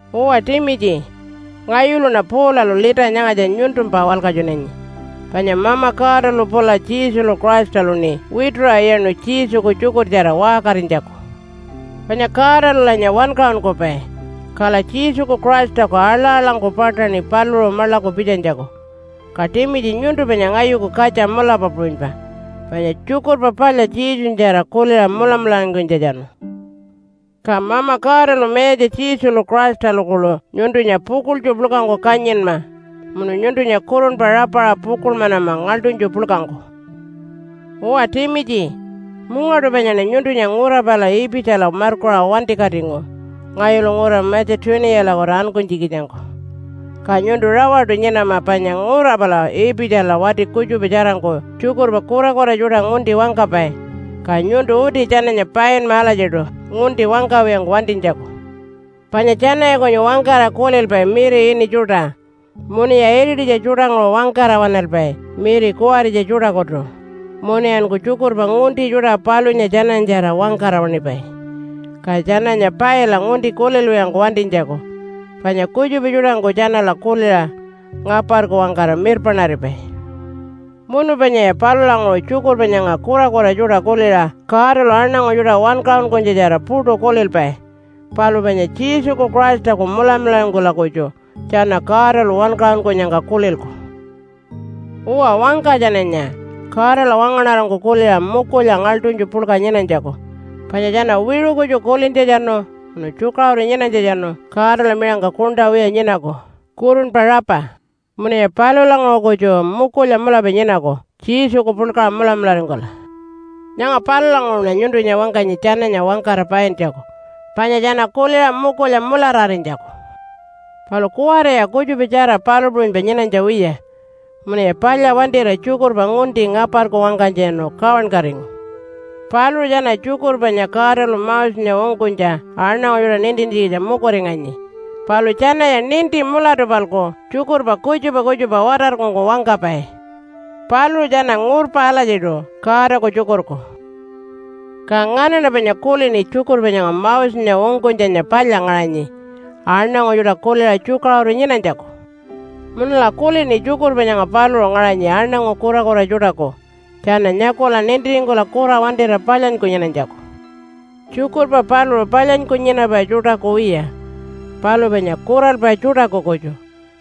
Uwa, Timitji, ngayuluṉa Paulalu lita nyangatja nyuntumpa walkatjunanyi. Panya Mama Godalu pula Jesulu Christaluṉi wituṟa iyaṉu Jesuku tjukurtjara waṟkarinytjaku. Panya Godalulanya wankaṟunkupai, kala Jesuku Christaku aḻa-aḻangku paṯaṉi paluṟu maḻaku pitjanytjaku. Ka Timitji nyuntu panya ngayuku katja mulapa puṟunypa, panya Tjukurpa Palya Jesunyatjara kuliṟa mulamularingkunytjatjanu. Ka Mama Godalu Mayatja Jesulu Christalu kuḻu nyuntunya pukuḻtju puḻkangku kanyinma munu nyuntunya kurunpa rapaṟa pukuḻmanama ngaḻṯunytju puḻkangku. Uwa Timitji, mungaṯu panyaṉa nyuntunya ngura pala Ipitjala markuṟa wantikatingu ngayulu ngura Matja-tuniyalakutu ankunytjikitjangku. Ka nyuntu rawaṯu nyinama panya ngura pala Ipitjala wati kutjupa tjarangku tjukurpa kurakura tjuṯa ngunti wangkapai. Ka nyuntu uti tjananya painma alatjiṯu ngunti wangkawiyangku wantinytjaku. Panya tjanaya kunyu wangkara kulilpai miri ini tjuṯa munuya irititja tjuṯanguṟu wangkara waṉalpai miri kuwaritja tjuṯakutu, munuyanku tjukurpa ngunti tjuṯa palunya tjananyatjara wangkara waṉipai. Ka tjananya paila ngunti kulilwiyangku wantinytjaku panya kutjupa tjuṯangku tjanala kuliṟa ngaparku wangkara mirpaṉaripai. Munu panyaya palulanguṟu, tjukurpa nyanga kurakura tjuṯa kuliṟa Godalu aṉangu tjuṯa wankaṟunkunytjatjara puṯu kulilpai. Palu panya Jesuku Christaku mulamularingkula kutju tjana Godalu wankaṟunkunyangka kulilku. Uwa, wangka tjananya Godala wangaṉarangku kuliṟa mukulya ngaḻṯunytju puḻka nyinanytjaku. Panya tjana wiṟu kutju kulintjatjanu munu tjukaṟuru nyinanytjatjanu Godala miṟangka kuṉṯa wiya nyinaku kurunpa rapa munuya palulanguṟu kutju mukulya mulapa nyinaku Jesuku puḻkaṟa mulamularingkula. Nyanga palulanguṟuṉa nyuntunya wangkanyi tjananya wangkara paintjaku, panya tjana kuliṟa mukulya mulararinytjaku. Palu kuwariya kutjupatjara palu puṟunypa nyinanytja wiya. Munuya palya wantira tjukurpa ngunti ngaparku wangkanytjatjanu kawankatingu. Paluṟu tjana tjukurpa panya Godalu Mosenya ungkunytja aṉangu tjuṯa nintintjikitja mukuringanyi. Palu tjanaya ninti mulatu-palku tjukurpa kutjupa kutjupa watarkungku wangkapai. Paluṟu tjana ngurpa alatjiṯu Godaku tjukurku. Ka nganaṉa panya kulini tjukurpa nyanga Mosenya ungkunytjanya palya ngaṟanyi aṉangu tjuṯa kuliṟa tjukaṟuru nyinanytjaku. Munula kulini tjukurpa nyanga paluṟu ngaṟanyi aṉangu kurakura tjuṯaku tjana nyakula nintiringkula kura wantira palyanyku nyinanytjaku. Tjukurpa paluṟu palyanyku nyinapai tjuṯaku wiya, palu panya kuralpai tjuṯaku kutju,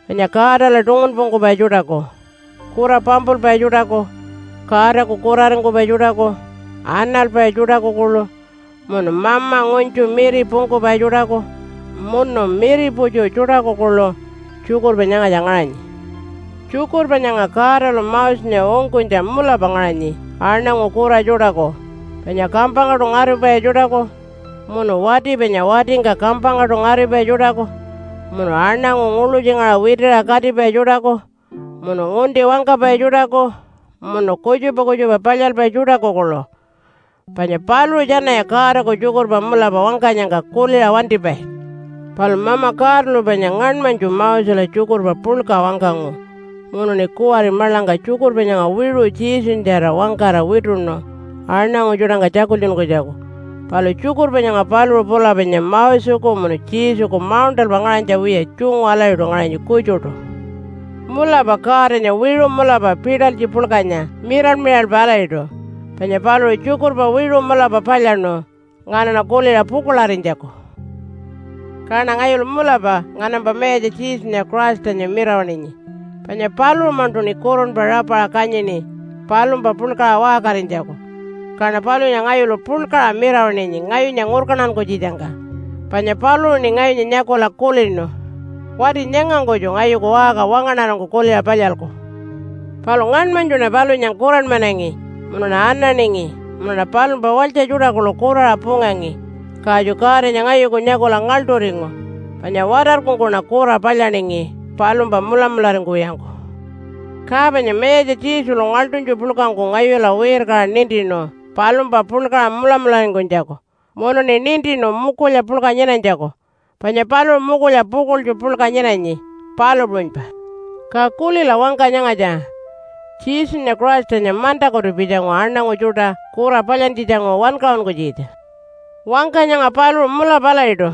panya Godala tungunpungkupai tjuṯaku, kura pampulpai tjuṯaku, Godaku kuraringkupai tjuṯaku, analpai tjuṯaku kuḻu, munu mama ngunytju miripungkupai tjuṯaku munu miriputju tjuṯaku kuḻu tjukurpa nyangatja ngaṟanyi. Tjukurpa nyanga Godalu Mosenya ungkunytja mulapa ngaṟanyi aṉangu kura tjuṯaku, panya kampangkaṯu ngaripai tjuṯaku, munu wati panya watingka kampangkaṯu ngaripai tjuṯaku, munu aṉangu nguḻutjingaṟa witiṟa katipai tjuṯaku, munu ngunti wangkapai tjuṯaku, munu kutjupa kutjupa palyalpai tjuṯaku kuḻu. Panya paluṟu tjanaya Godaku tjukurpa mulapa wangkanyangka kuliṟa wantipai. Palu Mama Godalu panya ngaṉmanytju Mosela tjukurpa puḻka wangkangu munuṉi kuwari maḻangka tjukurpa nyanga wiṟu Jesunyatjara wangkara wituṉu aṉangu tjuṯangka tjakultjunkunytjaku. Palu tjukurpa nyanga paluṟu pula panya Moseku munu Jesuku mauṉṯalpa ngaṟanytja wiya tjungu alatjiṯu ngaṟanyi kutjuṯu. Mulapa Godanya wiṟu mulapa pitalytji puḻkanya miral-miralpa alatjiṯu. Panya paluṟu tjukurpa wiṟu mulapa palyaṉu nganaṉa kuliṟa pukuḻarinytjaku. Kaṉa ngayulu mulapa nganampa Mayatja Jesunya Christanya mirawaṉinyi. Panya paluṟu-maṉṯuṉi kurunpa rapaṟa kanyini palumpa puḻkaṟa waṟkarinytjaku. Kaṉa palunya ngayulu puḻkaṟa mirawaṉinyi ngayunya ngurkantankunytjitjangka. Panya paluṟuṉi ngayunya nyakula kulinu, “Wati nyangangkutju ngayuku waṟka wangaṉarangku kuliṟa palyalku.” Palu ngaṉmanytjuṉa palunya kuranmanangi munuṉa ananingi, munuṉa palumpa walytja tjuṯa kuḻu kuraṟa pungangi. Katju Godanya ngayuku nyakula ngaḻṯuringu, panya watarkungkuṉa kura palyaningi palumpa mulamularingkuwiyangku. Ka panya Mayatja Jesulu ngaḻṯunytju puḻkangku ngayula wirkaṟa nintinu palumpa puḻkaṟa mulamularingkunytjaku. Munuṉi nintinu mukulya puḻka nyinanytjaku, panya paluṟu mukulya pukuḻtju puḻka nyinanyi, palu puṟunypa. Ka kulila wangka nyangatja, “Jesunya Christanya mantakutu pitjangu aṉangu tjuṯa kura palyantjitjanguṟu wankaṟunkunytjikitja.” Wangka nyanga paluṟu mulapa alatjiṯu,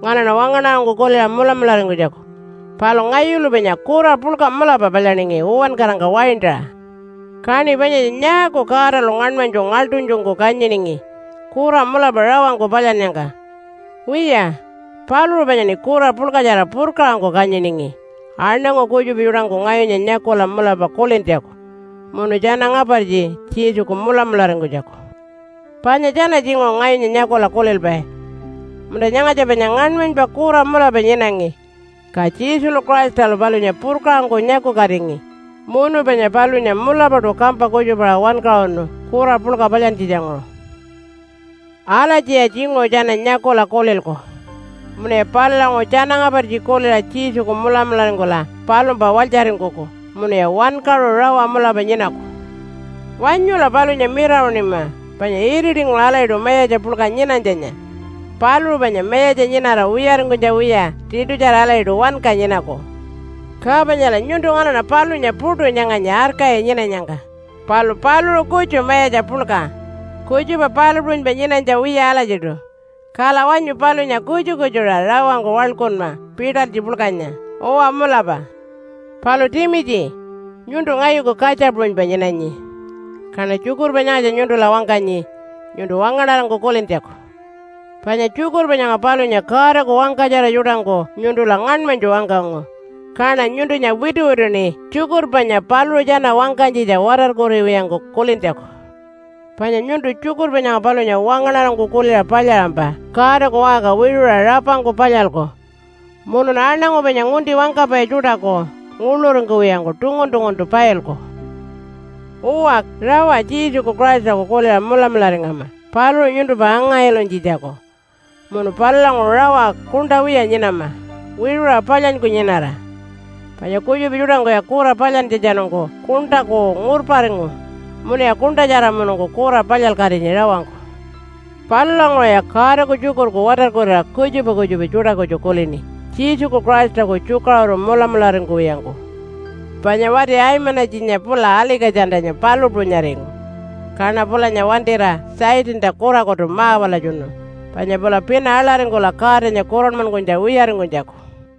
nganaṉa wangaṉarangku kuliṟa mulamularingkunytjaku. Palu ngayulu panya kura puḻka mulapa palyaningi uwankarangka waintaṟa. Kaṉi panyatja nyaaku Godalu ngaṉmanytju ngaḻṯunytjungku kanyiningi kura mulapa rawangku palyannyangka? Wiya, paluṟu panyaṉi kura puḻkatjara purkaṟangku kanyiningi aṉangu kutjupa tjuṯangku ngayunya nyakula mulapa kulintjaku, munu tjana ngapartji Jesuku mulamularingkunytjaku. Panya tjana tjinguṟu ngayunya nyakula kulilpai, “Munta, nyangatja panya ngaṉmanypa kura mulapa nyinangi. Ka Jesulu Christalu palunya purkaṟangku nyakukatingi munu panya palunya mulapaṯu kampa kutjupaṟa wankaṟunu kura puḻka palyantjitjanguṟu.” Alatjiya tjinguṟu tjana nyakula kulilku munuya palulanguṟu tjana ngapartji kuliṟa Jesuku mulamularingkula palumpa walytjaringkuku munuya wankaṟu rawa mulapa nyinaku. Wanyula palunya mirawaṉima panya iritinguṟu alatjiṯu Mayatja puḻka nyinanytjanya. Paluṟu panya Mayatja nyinara wiyaringkunytja wiya tiṯutjara alatjiṯu wanka nyinaku. Ka panyala nyuntu nganaṉa palunya puṯu nyanganyi arkayi nyinanyangka. Palu paluṟu kutju Mayatja puḻka, kutjupa palu puṟunypa nyinanytja wiya alatjiṯu. Kala wanyu palunya kutju-kutjuṟa rawangku waḻkunma pitalytji puḻkanya. Uwa mulapa! Palu Timitji, nyuntu ngayuku katja puṟunypa nyinanyi. Kaṉa tjukurpa nyangatja nyuntula wangkanyi nyuntu wangaṉarangku kulintjaku. Panya tjukurpa nyanga palunya Godaku wangkatjara tjuṯangku nyuntula ngaṉmanytju wangkangu. Kaṉa nyuntunya wituwituṉi tjukurpa panya paluṟu tjana wangkanytjitja watarkuriwiyangku kulintjaku. Panya nyuntu tjukurpa nyanga palunya wangaṉarangku kuliṟa palyaṟampa Godaku waṟka wiṟuṟa rapangku palyalku, munun aṉangu panya ngunti wangkapai tjuṯaku nguḻuringkuwiyangku tungun-tunguntu pailku. Uwa, rawa Jesuku Christaku kuliṟa mulamularingama paluṟu nyuntumpa anga-ilunytjitjaku, munu palulanguṟu rawa kuṉṯa wiya nyinama wiṟuṟa palyanyku nyinara. Panya kutjupa tjuṯangkuya kura palyantjatjanungku kuṉṯaku ngurparingu munuya kuṉṯatjaramunungku kura palyalkatinyi rawangku. Palulanguṟuya Godaku tjukurku watarkurira kutjupa kutjupa tjuṯa kutju kulini, Jesuku Christaku tjukaṟuru mulamularingkuwiyangku. Panya wati Aimanatjinya pula Alika-tjantanya palu puṟunyaringu. Kaṉa pulanya wantira Satanta kurakutu ma-walatjunu panya pula pina aḻaringkula Godanya kuranmankunytja wiyaringkunytjaku.